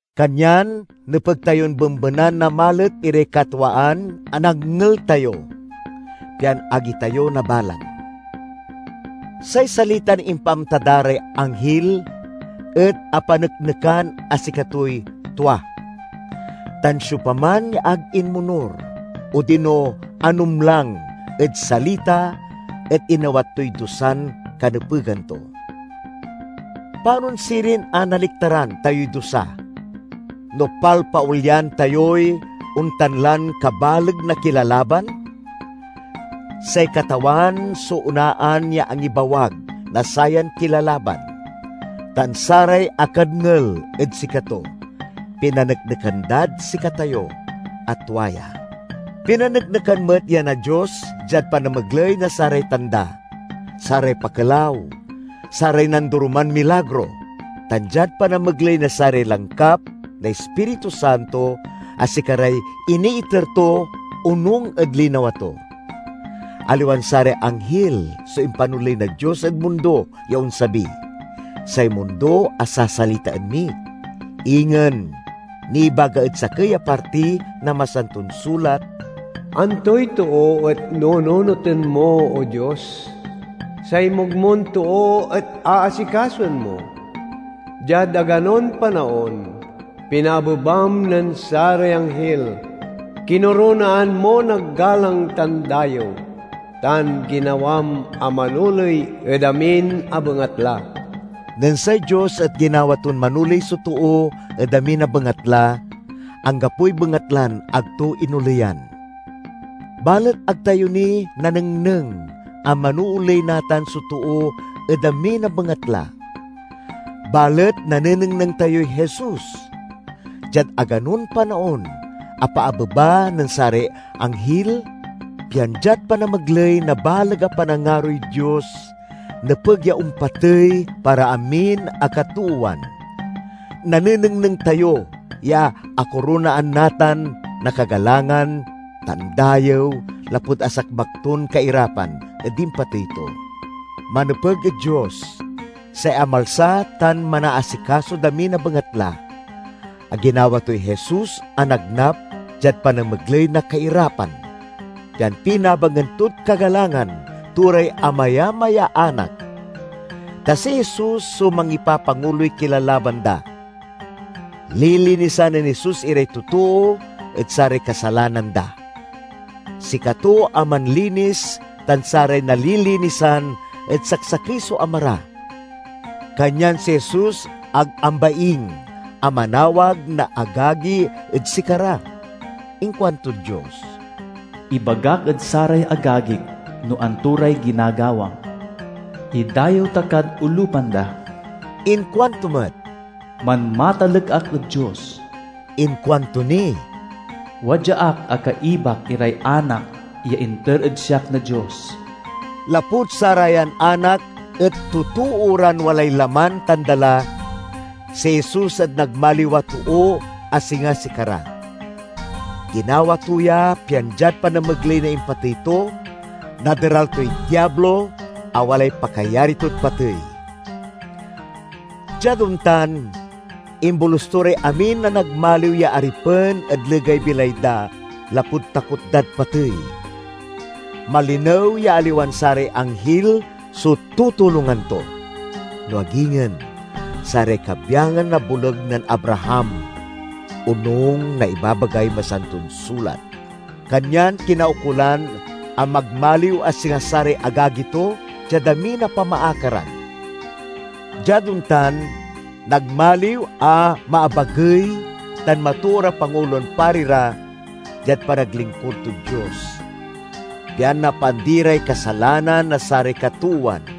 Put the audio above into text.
Kanyan nepeg tayon bembenan na malet iray katwaan a nadngel tayo, pian ag itayo nabalang. Say salitan impaamta da ray anghil et apaneknekan a sikatoy tua, tan siopaman ya ag inmonur odino anumlang ed salita et inawat toy dusan kanepegan to. Panon sirin a naliktaran tayoy dusa, no palpaolyan tayoy ontan lan kabaleg na kilalaban? Say Katawan so onaan ya angibawag na sayan kilalaban, tan saray akadngel ed sikato pinaneknekan dad sikatayo a tua ya. Pinaneknekan met ya na Dios diad panamegley na saray tanda, saray pakelaw, saray nandoroman milagro, tan diad panamegley na saray langkap na Ispiritu Santo a sikaray iniiter to onung ed linawa to. Aliwan saray anghil so impanoley na Dios ed mundo ya onsabi, say mundo a sasalitaen mi. Ingen, nibaga ed sakey a parti na Masanton Sulat: "Antoy too et nununoten mo, O Dios; say mugmon too, et aasikasoen mo? Diad aganon panaon pinaabebam nen saray anghil, kinoronaan mo na galang tan dayew, tan ginawam a manoley ed amin a bengatla." Nen say Dios et ginawa ton manoley so too ed amin a bengatla, anggapoy bengatlan ag to inoleyan. Balet ag tayo ni nanengneng a manooley natan so too ed amin a bengatla. Balet nanenengneng tayoy Jesus! Diad aganon panaon apaabeba nen saray anghil, pian diad panamegley na baleg a panangaroy Dios, nepeg ya ompatey para amin a katoowan. Nanenengneng tayo ya akoronaan natan na kagalangan tan dayew lapud asagmak ton kairapan ed impatey to. Manepeg ed Dios—say amalsa tan manaasikasod amin a bengatla—a ginawa toy Jesus a nagnap diad panamegley na kairapan, pian pinabangen tod kagalangan to ray amayamay ya anak. Ta si Jesus so mangipapanguloy kilalaban da. Lilinisan nen Jesus iray totoo ed saray kasalanan da; sikato a manlinis tan saray nalilinisan et saksakey so Ama ra, kanyan si Jesus ag ambaing a manawag na agagi ed sikara. Inkuantod Dios, "Ibagak ed saray agagik no anto ray ginagawam; idayew ta kad olupan da." Inkuanto met, "Manmatalek ak ed Dios." Inkuanto ni, "Wadya ak a kaibak iray anak ya inter ed siak na Dios." Lapud sarayan anak et totoo ran walay laman tan dala, si Jesus et nagmaliw a too a singa sikara. Ginawa to ya pian diad panamegley na impatey to, naderal toy Diablo a walay pakayari tod patey. Diad ontan imbolus to ray amin a nagmaliw ya aripen ed legay bilay da lapud takot dad patey. Malinew ya aliwan saray anghil so tutulongan to, no ag ingen "saray kabyangan na boleg nen Abraham," onung na ibabagay Masanton Sulat. Kanyan kinaukolan a magmaliw a singa saray agagi to diad amin a pamaakaran. Diad ontan nagmaliw a maabagey tan matoor a Pangulon Pari ra diad panaglingkur tod Dios, pian napaandi ray kasalanan na saray katoowan.